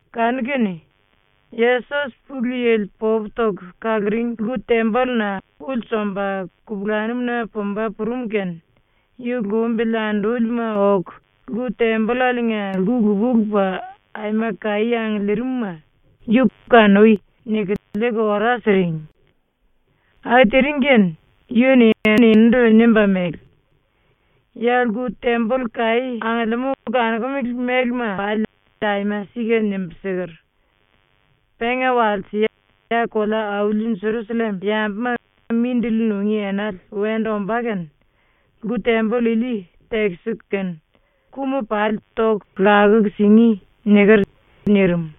Kanu-kene Yesos ⸤Pulu Yili popu toku kaluring⸥ lku-tembolluna ulsu omba kupulanum-na pumba purum kene yu lumbili andúlima oku lku-tembollaliinga lku lupa-lupa ⸤aima kaí angiliiringma⸥ yu “Kanui.” niku liiku ora siring. ⸤Aku tiring kene⸥ yu-ni eninindu nimba mele: “Ya ⸤lku-temboll kaí angiliimú⸥ kanokumele mélema pali aima sika nimbu siker: “⸤Penga walse ya kolea-auli Jerusallem yambuma mindili nungí enale wendu ombá kene⸥ lku-temboll ili tekisiku kene ku-ma pali toku kalalu singí.” niker.” nirim.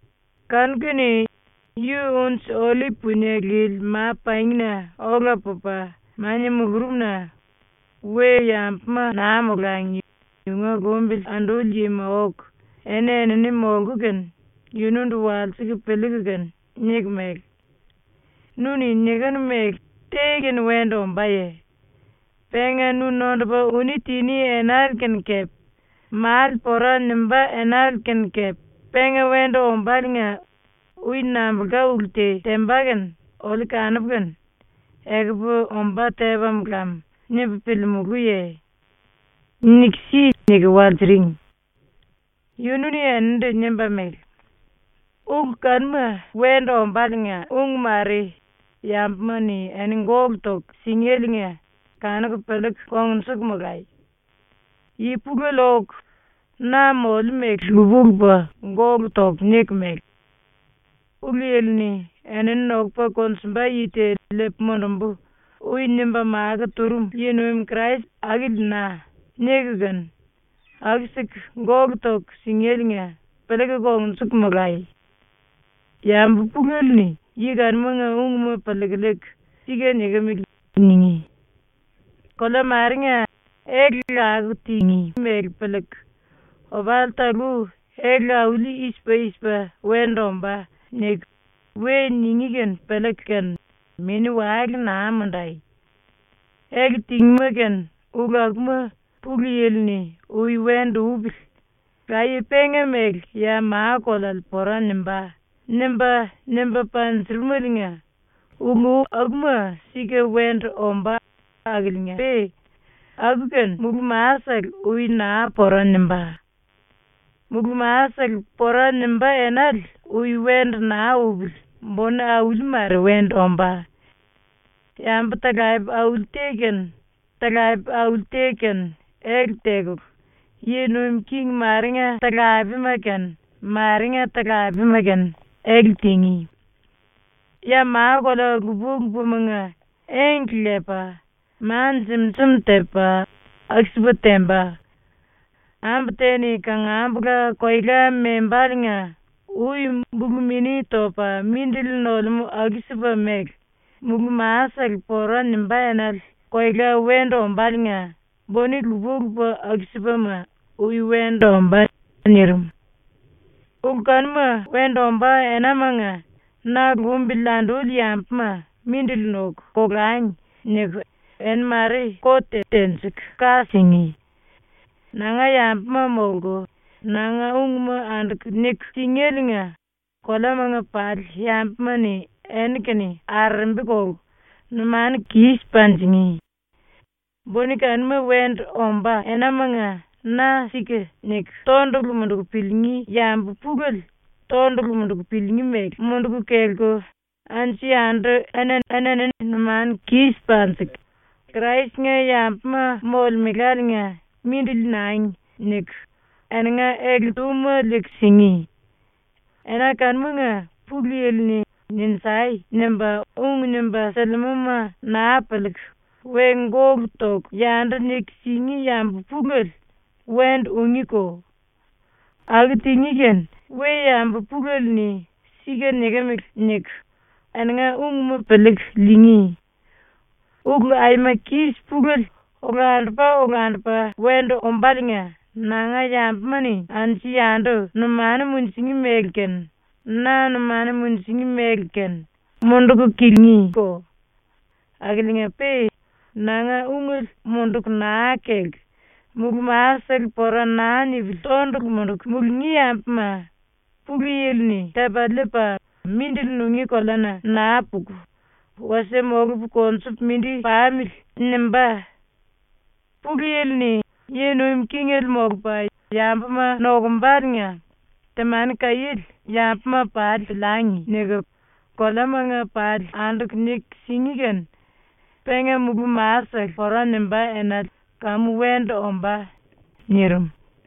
Kanu-kene yu Unji-Ollip Punie Lili Ma-Pangina ola pupa mania mulurumna we-yambuma naa molangi yunga lumbili anduli yima oku eni-enini molku kene yunundu walsiku piliiku kene niku mele: “Nu-ni nikinu mele te-kene wendu ombáye? Penga nu nondupa uní tiní enale kene kepe male pora nimbá enale kene kepe penga wendu ombáliinga ui nambulka ulu te temba kene oliu kanupu kene “Ekupu ombá tepam lam.” nimbu piliimulúye? Niku si.” niku walsiring. Yunu-ni eninindu nimba mele: “⸤Ulu kanuma wendu ombáliinga ung mare⸥ yambuma-ni eni gólu toku singéliinga kanuku piliiku kongnjuku molai. Yi pulele oku na moliu mele lupa-lupa gólu toku niku mele: “⸤Pulu Yili-ni “Enini nokupa konjumba yi te liipu mundumbu.” ui nimba makó turum⸥ yi-nuim Krais akili na.” niku kene aku-siku gólu toku singéliinga piliiku kongnjuku molai. Yambu pulele-ni yi kanumanga ungma piliiku liiku “Sika nikimili.” ningí. “Kolea marenga ele lakuku tingí mele piliiku, ‘Opali talú ele auli i-sipa i-sipa wendu ombá.’ niku we ningí kene piliiku kene mini-wale naa mundai. Ele tingíma kene ulu akuma Pulu Yili-ni ‘Ui wendu upili. Laye penga mele ya ma-koleale pora nimbá.’ nimba, nimba panjurumeliinga ulu akuma sika wendu ombá akiliinga-pe aku-kene mulú-masele ui naa pora nimbá. ⸤Mulú-masele pora nimbá enale ui wendu naa upili buni auli mare wendu ombá.⸥ Yambu-talape auli te kene talape auli te kene ele tekulu, yi nuim king marenga talapema-kene marenga talapema-kene ele tingí. Ya ma-kolea lupa-lupamanga engle lepa, ma jim-jim tepa, aku-sipa temba. Ambu te-ni kangambula koela membáliinga ui bulu mini topa mindili nolemú aku-sipa mele mulú-masele pora nimbá enale koela wendu ombáliinga buni lupa-lupa aku-sipama ui wendu ombá.” ⸤nirim⸥. “Ulu kanuma wendu ombá enamanga ‘⸤Na lumbili anduli yambuma⸥ mindili noku, kolangi.’ niku ⸤eni mare⸥ kot tenjiku ka singí. Nanga yambuma molku nanga ungma anduku niku singéliinga koleamanga pali yambuma-ni eni-kene arerembi kolku numanu kis panjingí. ⸤Buni kanuma wendu ombá⸥ enamanga na ‘Sika’ niku tondulu munduku piliingí yambu pulele tondulu munduku piliingí mele munduku kelku anju-yandu eni-enini numanu kis panjiku, ‘Krais-nga yambuma molemeláliinga mindili nangi.’ niku eninga ele-túma liiku singí. ⸤Ena kanumanga⸥ Pulu Yili-ni “Ninjai!” nimba ung nimba silimúma naa piliiku we gólu toku yandu niku singí yambu pulele wendu ungíko. Aku tingí kene we-yambu pulele-ni ‘Sika nikimili.’ niku eninga ungma piliiku liingí. Ulu aima kis pulele olandupa-olandupa wendu ombáliinga nanga yambuma-ni ⸤anju-yandu⸥ numanu munjingí mele ⸤kene, na numanu munjingí mele kene⸥ munduku kilingíko. Akiliinga-pe nanga ungele munduku naa kelku mulú-masele pora naa nipili tondulu munduku mulungí yambuma ⸤Pulu Yili-ni⸥ tepa liipa ‘Mindili nungí koleana naa puku wasie molupu konjupu mindi pamili.’ nimbá. Pulu Yili-ni yi-nuim kingele molupa yambuma nokumbaliinga temani kaiéle ‘Yambuma pali piliangi.’ niku koleamanga pali anduku niku singí kene penga mulú-masele pora nimbá enale kamu wendu ombá.” ⸤nirim.⸥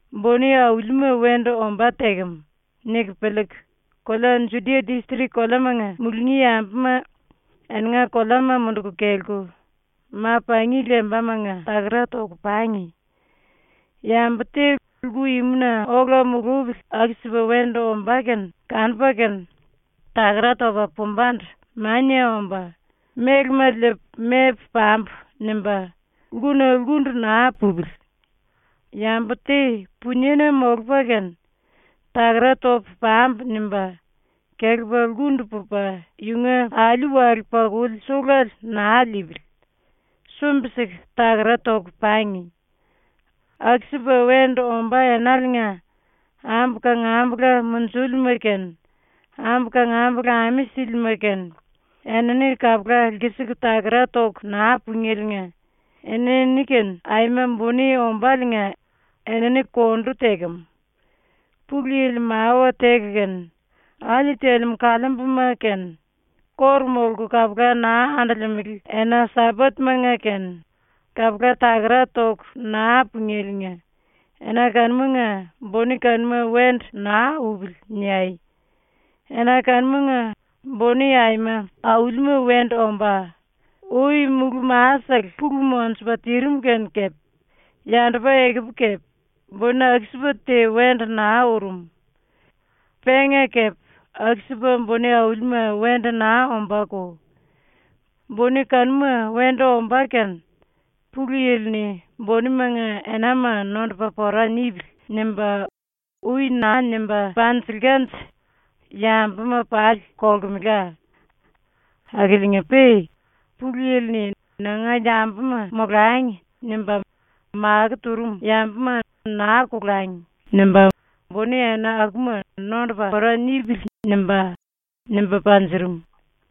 ⸤‘uni aulima wendu ombá tekem.’ niku piliiku⸥ kolea Judia distrik koleamanga mulungí yambuma ⸤eninga koleama munduku kelku⸥ ma-pangi lembamanga takara toku pangi. Yambu te lku-imuna ola mulupili ⸤aku-sipa wendu ombá kene kanupa kene⸥ takara topa pumbandu mania omba ‘Mélema liipu mepu pambu.’ nimba lkuna lkundu naa pupili. Yambu te puniena molupa kene ⸤‘akara topu pambu.’ nimba⸥ kelepa lkundu pupa yunga alí-wale-pakuli suluele naa liipili. ⸤Sumbi-siku takara toku pangi.⸥ Aku-sipa wendu ombá enaliinga ambu kangambula munjúlima kene, ambu kangambula ame sílima kene, ⸤enini kapula lkisiku takara toku naa pungéliinga⸥ enini-kene aima buni ombáliinga enini kondu tekem. “Pulu Yili mawa teku kene, ‘Alí telemú kaliimbuma kene ⸤kóru molku kapula naa andolemele⸥ ena-Sambat-manga kene kapula takara toku naa pungéliinga ena kanumanga buni kanuma wendu naa upili.’ niai. Ena kanumanga buni aima aulima wendu ombá, ui mulú-masele pulu monjupa tirim kene kepe, yandupa ekupu kepe buni aku-sipa te wendu naa urum. Penga kepe aku-sipa buni aulima wendu naa ombáko. ⸤Buni kanuma wendu ombá kene Pulu Yili-ni⸥ ‘Bunimanga enama nondupa pora nipili.’ nimba ui naa nimba panjilkanje yambuma pali kolkemela. Akiliinga-pe Pulu Yili-ni ‘Nanga yambuma molangi.’ nimba makó turum yambuma ‘naa kolangi.’ nimba ‘Buni ena akuma nondupa pora nipili.’ nimba, nimba panjurum.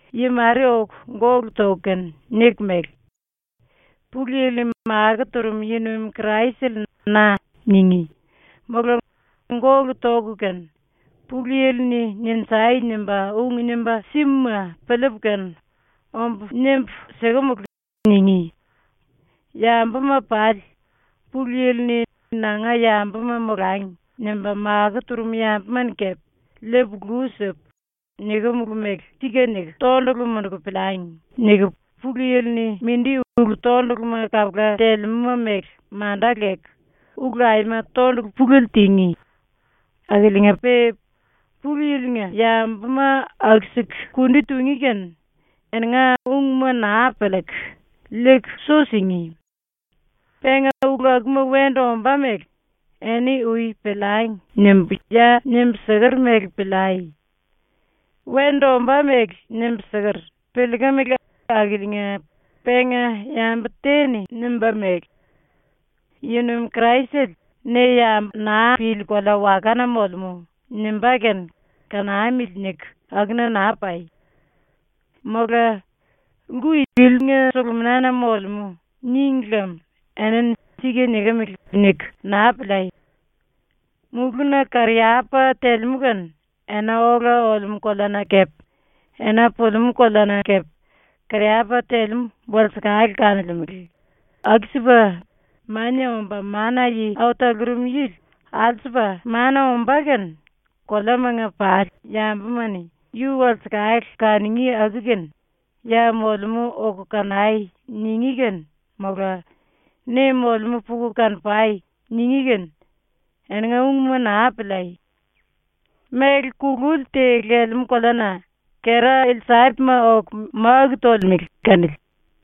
Yi mare oku gólu toku kene niku mele: “Pulu Yili-ni makó turum yi-nuim Kraisele na.” ningí, mola gólu toku kene “Pulu Yili-ni “Ninjai!” nimba ung nimba simuma piliipu kene ombu nimbu sikemulu.” ningí. ‘Yambuma pali, Pulu Yili-ni ‘Nanga yambuma molangi.’ nimba makó turum yambuma-ni kepe liipu lu sipu, nikimulu mele ‘Sika’ niku tondulu munduku piliangi.’ niku Pulu Yili-ni mindi ulu-tonduluma kapula telemúma mele manda leku ulu aima tondulu pulele tingí. Akiliinga-pe Pulu Yili-nga yambuma aku-siku kundi tungí kene eninga ungma naa piliiku, liiku su singí. Penga ulu akuma wendu ombá mele ‘Eni ui piliangi.’ nimbu ya nimbu siker mele piliai. “⸤Wendu ombá mele nimbu siker, piliikimili⸥ akiliinga penga yambu te-ni nimba mele: “⸤Yi-nuim Kraisele⸥ ne yambu naa pili kolea-wakana molemú.” nimbá kene ‘Kanamili.’ niku akuna naa pai. Mola “Lku ilinga suluminana molemú.” níngi lem enini ‘Sika nikimili.’ niku naa piliai. Mulúna kariyapa telemú kene ena ola olemú koleana kepe ena pulimú koleana kepe kariyapa telemú walsekale kanolemele, aku-sipa Mania Omba Mana-Yi Au Talurum Yili ⸤alsupa⸥ mania ombá kene koleamanga pali yambuma-ni yu walsekale kanungí aku-kene “Ya molemú oku kanai.” ningí kene, mola “Ne molemú puku kano-pai.” ningí kene, eninga ungma naa piliai. Méle kululi te lelemú koleana kera-ilsapima oku máku tolemele kanili.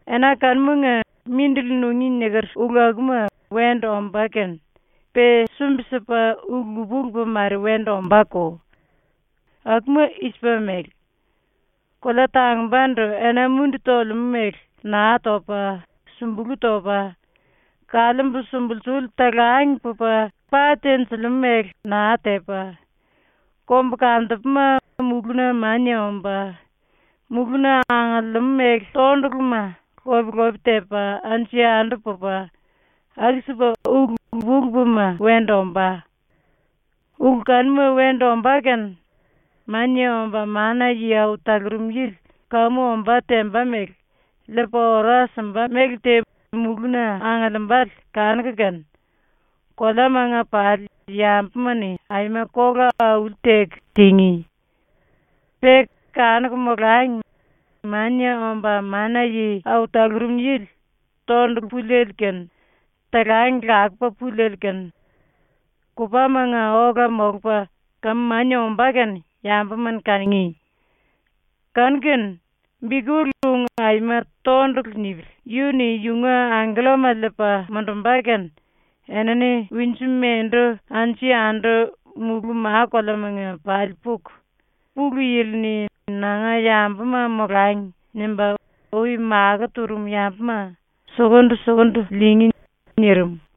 “Ena kanumanga mindili nungí niker ulu akuma wendu ombá kene pe sumbi-sipa ⸤ulu lupa-lupa mare wendu ombáko. Akuma i-sipa mele:⸥ ‘Kolea tangumbandu ena-mundi tolemú mele naa topa, sumbulú topa, kaliimbu sumbulsuli talang pupa pa tenjilimú mele naa tepa, kombukantupuma mulúna mania omba, mulúna angiliimú méle tonduluma lope-lope tepa anju-yandu pupa, aku-sipa ulu lupa-lupama wendu ombá.’ Ulu kanuma wendu ombá kene Mania Omba Mana-Yi Au Talurum Yili kamu ombá temba mele liipa ora simba méle te mulúna angiliimbale ⸤kanuku kene⸥ koleamanga pali yambuma-ni aima kola auli-teku tingí. Pe kanuku molangi Mania Omba Mana-Yi Au Talurum Yili tondulu puliele kene, talang lakupa puliele kene kupámanga ola molupa kamu mania ombá ⸤kene⸥ yambuma-ni kanungí. Kanu-kene bikull ung aima tondulu nipili yu-ni yunga angkellama liipa mundumba kene enini winju-mendu anju-yandu mulú ⸤ma-koleamanga⸥ pali puku Pulu Yili-ni ‘Nanga yambuma molangi.’ nimba ui makó turum yambuma sukundu-sukundu liingí.” ⸤nirim.⸥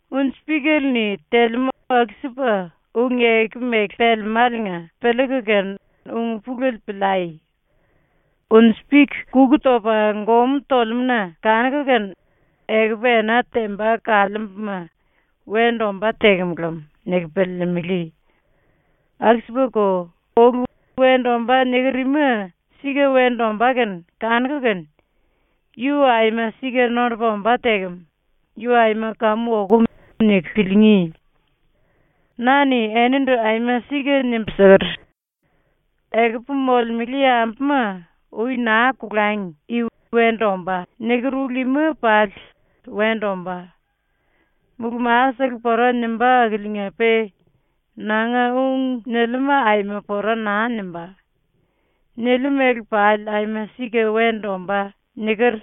“Unji-píkele-ni telemú aku-sipa ung-eku mele pelemáliinga piliiku kene ung-pulele piliai. Unji-pik kuku topa gomú tolemú-na kanuku kene ‘Ekupu ena temba kaliimbuma wendu ombá tekem lem.’ niku piliilimili. Aku-sipako, ulu “Wendu ombá.” niker ima sika wendu ombá kene kanuku kene ‘Yu aima sika nondupa ombá tekem. Yu aima kamu okum.’ niku piliingí. Na-ni enindu aima sika nimbu siker: “Ekupu molemele yambuma ui naa kolangi i “Wendu ombá.” niker ulu ima pali wendu ombá. Mulú-masele pora nimbá akiliinga-pe nanga ung niliuma aima pora naa nimbá. ⸤Niliu mele pali aima sika wendu ombá.⸥” niker.”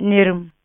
⸤nirim.⸥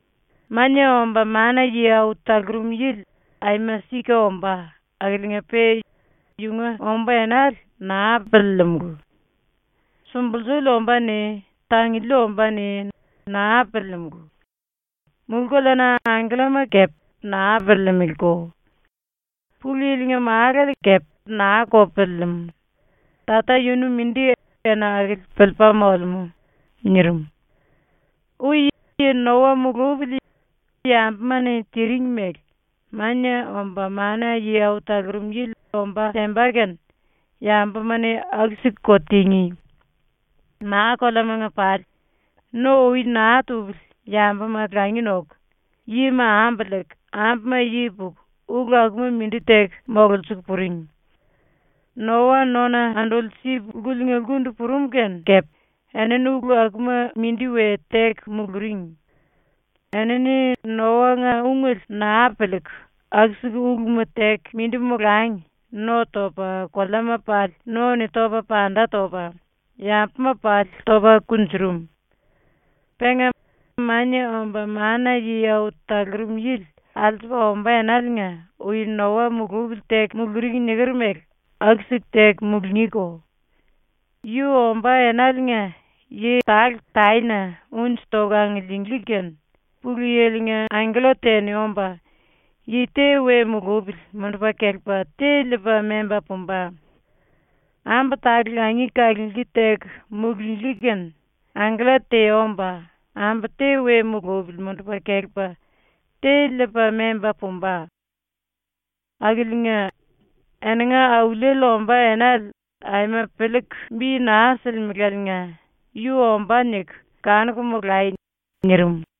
“⸤Mania Omba Mana-Yi Au Talurum Yili aima sika ombá⸥ akiliinga-pe yunga ombá enale naa piliilimulu. Sumbulsuli ombáne, tanguli ombáne naa piliilimulu. Mulú-koleana angkellama kepe naa piliilimiliko. Pulu Yili-nga Málale kepe naa-ko piliilimú. Tata yunu mindi ⸤ena akili⸥ piliipa molemú.” ⸤nirim.⸥ “Ui yi Noa mulupili yambuma-ni tiring mele Mania Omba Mana-Yi Au Talurum Yili ombá temba kene yambuma-ni aku-siku-ko tingí. ⸤Ma-koleamanga pali⸥ no ui naa tupili yambuma langi noku, yima ambu liiku, ambuma yi puku, ulu akuma mindi teku mololsiliiku puring. Noa nona anduli sip lkuliinga lkundu purum kene kepe enini ulu akuma mindi we teku muluring. Enini ⸤Noa-nga ungele⸥ naa piliiku aku-siku uluma teku mindi molangi no topa ⸤koleama pali no-ni topa panda topa⸥ yambuma pali topa kunjurum. Penga Mania Omba Mana-Yi Au Talurum Yili alsupa ombá enaliinga ui Noa mulupili teku muluring niker mele aku-siku teku mulungíko. Yu ombá enaliinga yi tale taena unji toku angiliinglí kene ⸤Pulu Yili-nga angkella te-ni omba⸥ yi te we mulupili mundupa kelepa te liipa memba pumba. Ambu tale langi kalunglí teku mulunglí kene ⸤angkella te omba⸥ ambu te we mulupili mundupa kelepa te liipa memba pumba. “Akiliinga, eninga Auliele ombá enale aima piliiku bi naa silimelaliinga ‘Yu ombá.’ niku kanuku molai.” ⸤nirim⸥.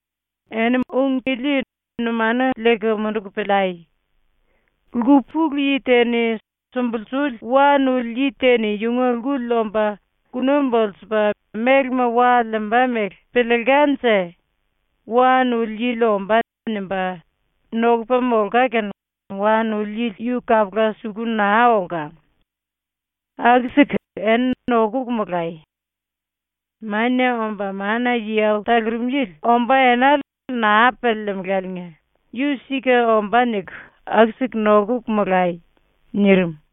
“Eni ung ili numanu liiku munduku piliai: Lku pulu yi te-ni sumbulsuli wa nuli yi te-ni yunga lkuli omba kuna bulsupa mélema wa liimba mele piliilkanje ‘Wa nuli yili ombá.’ nimba nokupa molka kene wa nuli yili yu kapula suku naa olka. Aku-siku eni nokuku molai. Mania Omba Mana-Yi Au Talurum Yili ombá enale naa piliilimiléliinga ‘Yu sika ombá.’ niku aku-siku nokuku molai.” ⸤nirim.⸥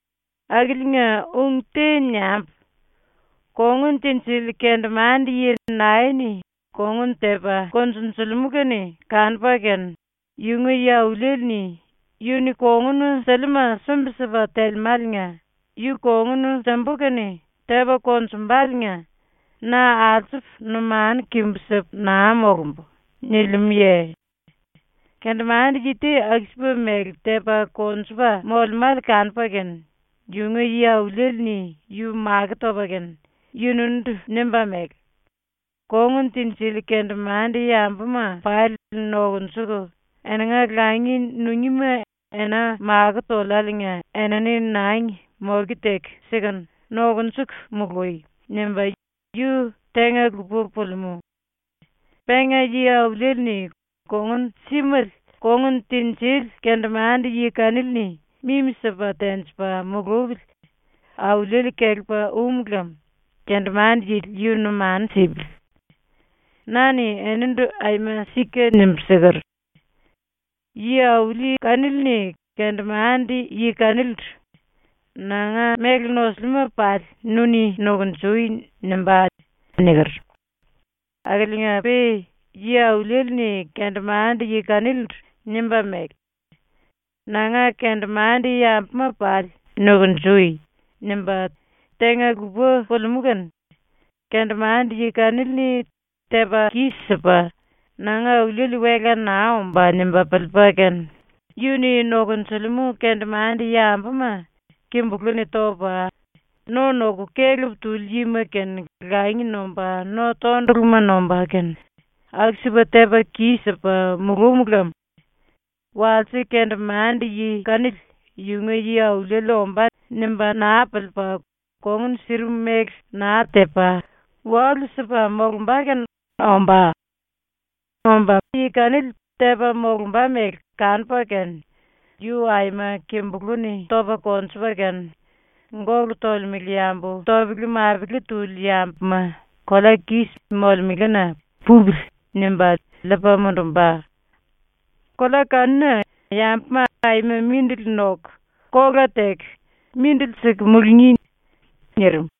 “⸤Akiliinga ung te niambu:⸥ “Kongun tinjili kendemande-yi nae-ni kongun tepa konjunjulimú kene kanupa kene yunga yi-auliele-ni ‘Yu-ni kongun siliuma sumbi-sipa telemáliinga yu kongun simbu kene tepa konjumbaliinga na alsupu numanu kimbu sipu naa molumbu.’ nilimúye? Kendemande-yi te aku-sipa mele tepa konjupa molemále kanupa kene yunga yi-auliele-ni yu makó topa kene yunundu nimba mele: “Kongun tinjili kendemande-yambuma pali nokunjuku eninga langi nungíma ena makó toliáliinga enini nangi moke teku sikunu, nokunjuku mului.” nimba ⸤yu tenga-lupa pulimú⸥. Penga yi-auliele-ni kongun símele kongun tinjili kendemande-yi kanili-ni mimi-sipa tenjipa mulupili auliele kelepa um lem kendemande-yili yu numanu sipili. Na-ni enindu aima sika nimbu siker: “Yi-auli kanili-ni kendemande-yi kanilindu “Nanga méle nosiliuma pali nu-ni nukunjui.” nimbá.” niker. Akiliinga-pe ⸤yi-auliele-ni kendemande-yi kanilindu nimba mele: “Nanga kendemande-yambuma pali nukunjui.” nimba tenga-lupa pulimú kene⸥ kendemande-yi kanili-ni tepa kis-sipa “Nanga auliele wela naa ombá.” nimba piliipa kene yu-ni nokonjilimú kendemande-yambuma kimbulú-ni topa, no noku kelep tuli yima kene langi nomba no tonduluma nomba kene, aku-sipa tepa kis-sipa mulúm lem walse kendemande-yi kanili ‘Yunga yi-auliele ombá.’ nimba naa piliipa ⸤kongun sirim mele naa tepa⸥ walu-sipu molumba kene ombá. Omba ⸤yi kanili tepa molumba mele kanupa kene⸥ yu aima kimbulú-ni topa konjupa kene, gólu tolemele yambu topele-mapele tuli yambuma ⸤kolea kis⸥ molemelena ‘Pupili.’ nimba liipa mundumba. Kolea kanuna yambuma aima mindili noku kola teku mindili siku mulungí.” ⸤nirim.⸥